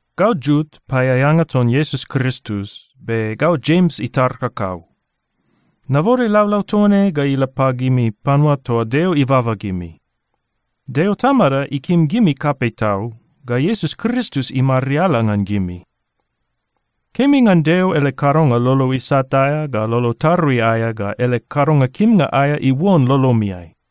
Gau Jut, paeaeanga ton Iesus Kristus, be gau Jems itar kakau. Nabode laulau toa ne ga ila pagimi panua toa Deo ibaba gimi. Deo Tamada ikim gimi kapei tau, ga Iesus Kristus imariala ngan gimi. Kemi ngan Deo ele kadonga lolo isat aea ga lolo tarui aea ga ele kadonga kimnga aea iuon lolomiai.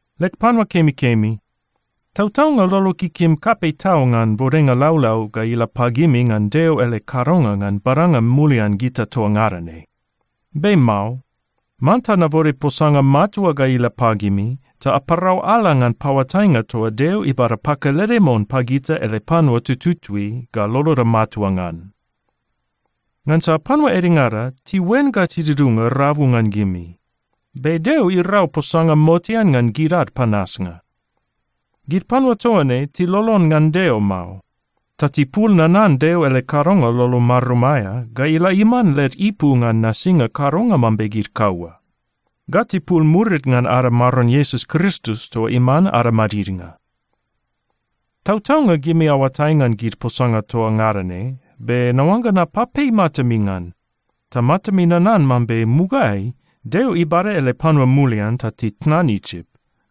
Leg panua kemikemi, tautaunga lolog ikim kapei tau ngan bodenga laulau ga ila pagimi ngan Deo ele kadonga ngan badanga mulian gita toa ngada ne. Be mao. Manta nabode posanga matua ga ila pagimi ta aparau ala ngan paoatainga toa Deo ibada pakelede mon pagita ele panua tututui ga loloda matua ngan. Ngansa panua edengada tiuen ga tidudunga rabu ngan gimi. Be Deo irau posanga motean ngan gid ad panasnga. Gid panua toa ne tilolon ngan Deo mao, ta tipul nanan Deo ele kadonga lolo marum aea ga ila iman led ipu ngan nasinga kadonga mambe gid kaua. Ga tipul murid ngan ada Maron Iesus Kristus toa iman ada madidnga. Tautaunga gimi aoatai ngan gid posanga toa ngada ne, be naoangga napapei matami ngan, ta matami nanan mambe mugaeai Deo ibada ele panua mulian ta titnan Isip,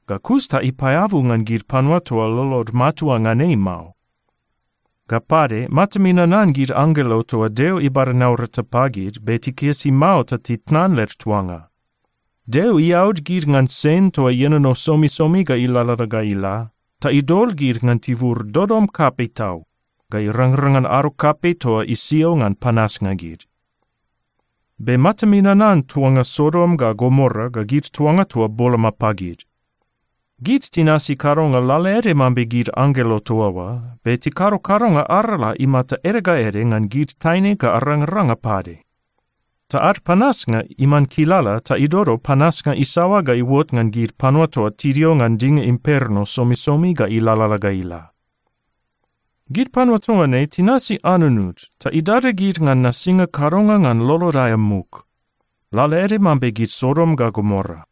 ga kus ta ipaeabu ngan gid panua toa lolod matua ngan ei mao. Ga pade, matami nanan gid anggelo toa Deo ibada naurata pagid, be tikisi mao ta titnan led tuanga. Deo iaud gid ngan sen toa ienono somisomi ga ilalala ga ila, ta idol gid ngan tibur dodom kapei tau ga irangrang ngan ado kapei toa isio ngan panasnga gid. Be matami nanan tuanga Sodom ga Gomora ga gid tuanga toa boloma pagid. Gid tinasi kadonga lalaede mambe gid anggelo toa oa, be tikado kadonga arala imata ede ga ede ngan gid taine ga arangaranga pade. Ta ad panasnga iman kilala ta idodo panasnga isaoa ga iuot ngan gid panua toa tidio ngan dinga imperno somisomi ga ilalala ga ila. Gid panua toa ne tinasi anunud ta idada gid ngan nasinga kadonga ngan lolod aea muk, lalaede mambe gid Sodom ga Gomora.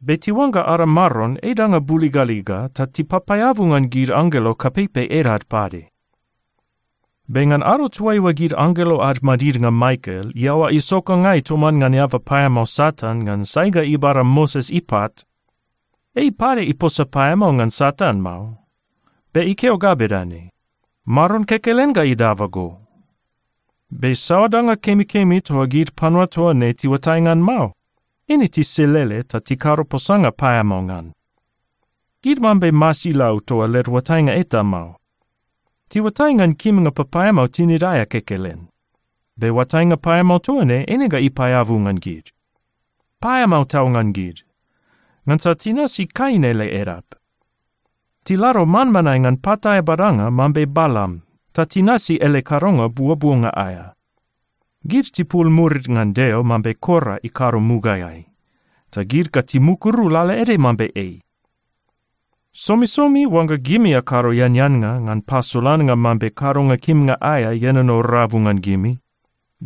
Be tiuangga ada Maron ei danga buligaliga ga tipapaeabu ngan gid anggelo kapeipei edad pade. Be ngan ado toaiua gid anggelo ad madidnga Mikael iaoa isokangai toman ngan eaba paeamao Satan ngan sai ga ibada Moses ipat, ei pade iposa paeamao ngan Satan mao, be ikeo ga bedane, “Maron kekelen ga idaba go.” Be saoa danga kemikemi toa gid panua toa ne tiuatai ngan mao, eine tiselele ta tikado posanga paeamao ngan. Gid mambe masilau toa led oatainga eta mao. Tiuatai ngan kimnga papaeamao tinid aea kekelen. Be oatainga paeamao toa ne eine ga ipaeabu ngan gid. Paeamao tau ngan gid! Ngansa tinasi Kain ele edap. Tilado manmanae ngan pat aea badanga mambe Balam, ta tinasi ele kadonga buobuonga aea. Gid tipul murid ngan Deo mambe Kora ikado mugaeai, ta gid ga timukuru lalaede mambe ei. Somisomi oangga gimi akado eaneannga ngan pasolannga mambe kadonga kimnga aea ienono rabu ngan gimi,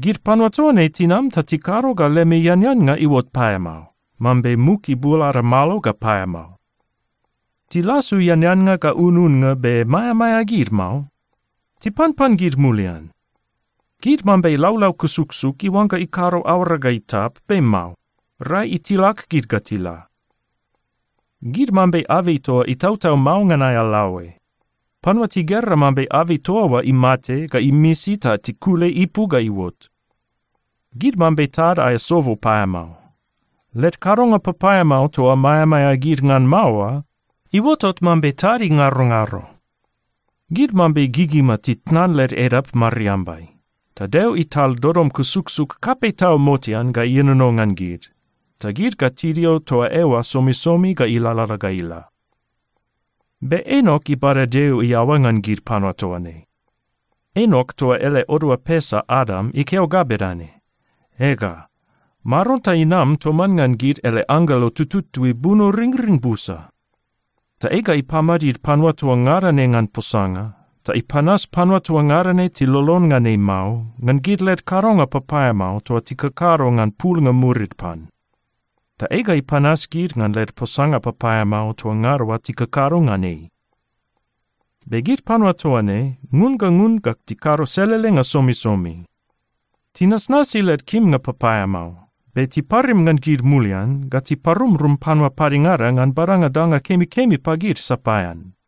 gid panua toa ne tinam ta tikado ga lemi eaneannga iuot paeamao, mambe muk ibul ada malo ga paeamao. Tilasu eaneannga ga ununnga be maeamaea gid mao. Tipanpan gid mulian. Gid mambe laulau kusuksuk iuangga ikado aoara ga itap, be mao. Rai itilak ga ila. Gid mambe abei toa itautau mao ngan aea laoe. Panua tigera mambe abei toa oa imate ga imisi ta tikule ipu ga iuot. Gid mambe tad aea sobo paeamao. Led kadonga papaeamao toa maeamaea gid ngan mao oa, iuotot mambe tad ingarongaro. Gid mambe gigima titnan led edap mariambai. Ta Deo ital dodom kusuksuk kapei tau motean ga ienono ngan gid, ta gid ga tidio toa eoa somisomi ga ilalala ga ila. Be Enok ibada Deo iaoa ngan gid panua toa ne. Enok toa ele odoa pesa Adam, ikeo ga bedane, “Ega, Maron ta inam toman ngan ele anggelo tututui bunoringring busa. Ta ei ga ipamadid panua toa ngada ne ngan posanga, ta ipanas panua toa ngada ne tilolon ngan ei mao, ngan gid led kadonga papaeamao toa tikakado ngan pulnga murid pan. Ta ei ga ipanas gid ngan led posanga papaeamao toa ngada oa tikakado ngan ei.” Be gid panua toa ne ngun ga ngun ga tikado selelenga somisomi. Tinasnasi led kimnga papaeamao. Be tiparim ngan gid mulian ga tiparumrum panua padengada ngan badanga danga kemikemi pagid sapaean.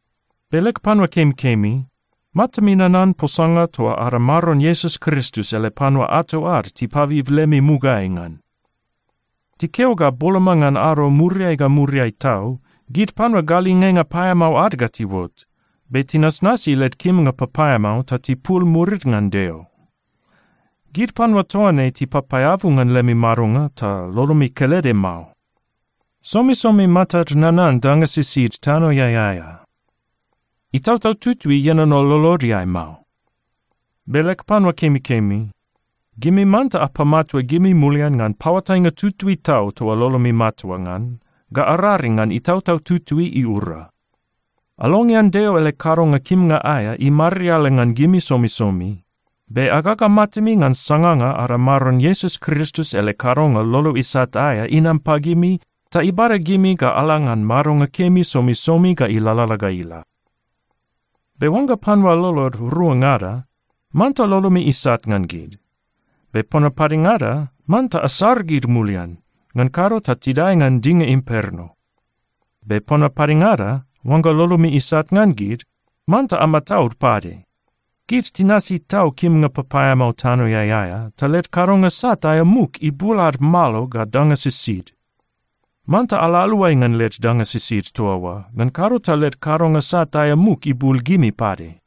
Be leg panua kemikemi, matami nanan posanga toa ada Maron Iesus Kristus ele panua ato ad tipabib lemi mugaeai ngan. Tikeo ga boloma ngan ado muriai ga muriai tau, gid panua galingenga paeamao ad ga tiuot, be tinasnasi led kimnga papaeamao ta tipul murid ngan Deo. Gid panua toa ne tipapaeabu ngan lemi madonga ta lolomi kelede mao. Somisomi matad nanan danga sisid tanoeai aea. Itautau Tutui ienono lolodeai mao. Be leg panua kemikemi, gimi manta apamatua gimi mulian ngan paoatainga tutui tau toa lolomi matua ngan, ga araring ngan Itautau Tutui iura. Alongean Deo ele kadonga kimnga aea imariala ngan gimi somisomi, be agaga matami ngan sanganga ada Maron Iesus Kristus ele kadonga lolo isat aea inam pagimi ta ibada gimi ga ala ngan madonga kemi somisomi ga ilalala ga ila. Be oangga panua lolod ruangada, manta lolomi isat ngan gid. Be panua padengada, manta asar gid mulian. Ngan kado ta tidae ngan dinga imperno. Be panua padengada, oangga lolomi isat ngan gid, manta amataud pade. Gid tinasi tau kimnga papaeamao tanoeai aea, ta led kadonga sat aea muk ibul ad malo ga danga sisid. Manta ala aluai ngan led danga sisid toa oa, ngan kado ta led kadonga sat aea muk ibul gimi pade.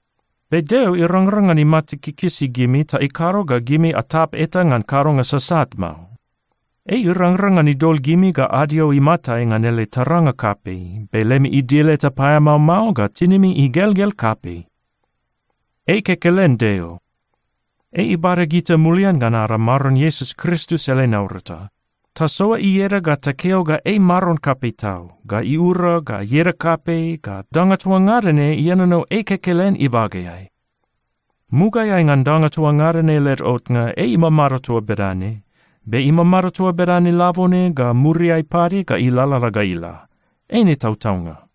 Be Deo irangrang ngan imata kikisi gimi ta ikado ga gimi atap eta ngan kadonga sasat mao. Ei irangrang ngan idol gimi ga adio imatai ngan ele taranga kapei, be lemi idil eta paeamao mao ga tinimi igelgel kapei. Ei kekelen Deo. Ei ibada gita mulian ngan ada Maron Iesus Kristus ele naurata. Tasoa ieda ga takeo ga ei Maron kapei tau, ga iura ga ieda kapei, ga danga toa ngada ne ienono ei kekelen ibageai. Mugaeai ngan danga toa ngada ne led otnga, ei imamado toa bedane, be imamado toa bedane labone, ga muriai pade ga ilalala ga ila. Eine tautaunga.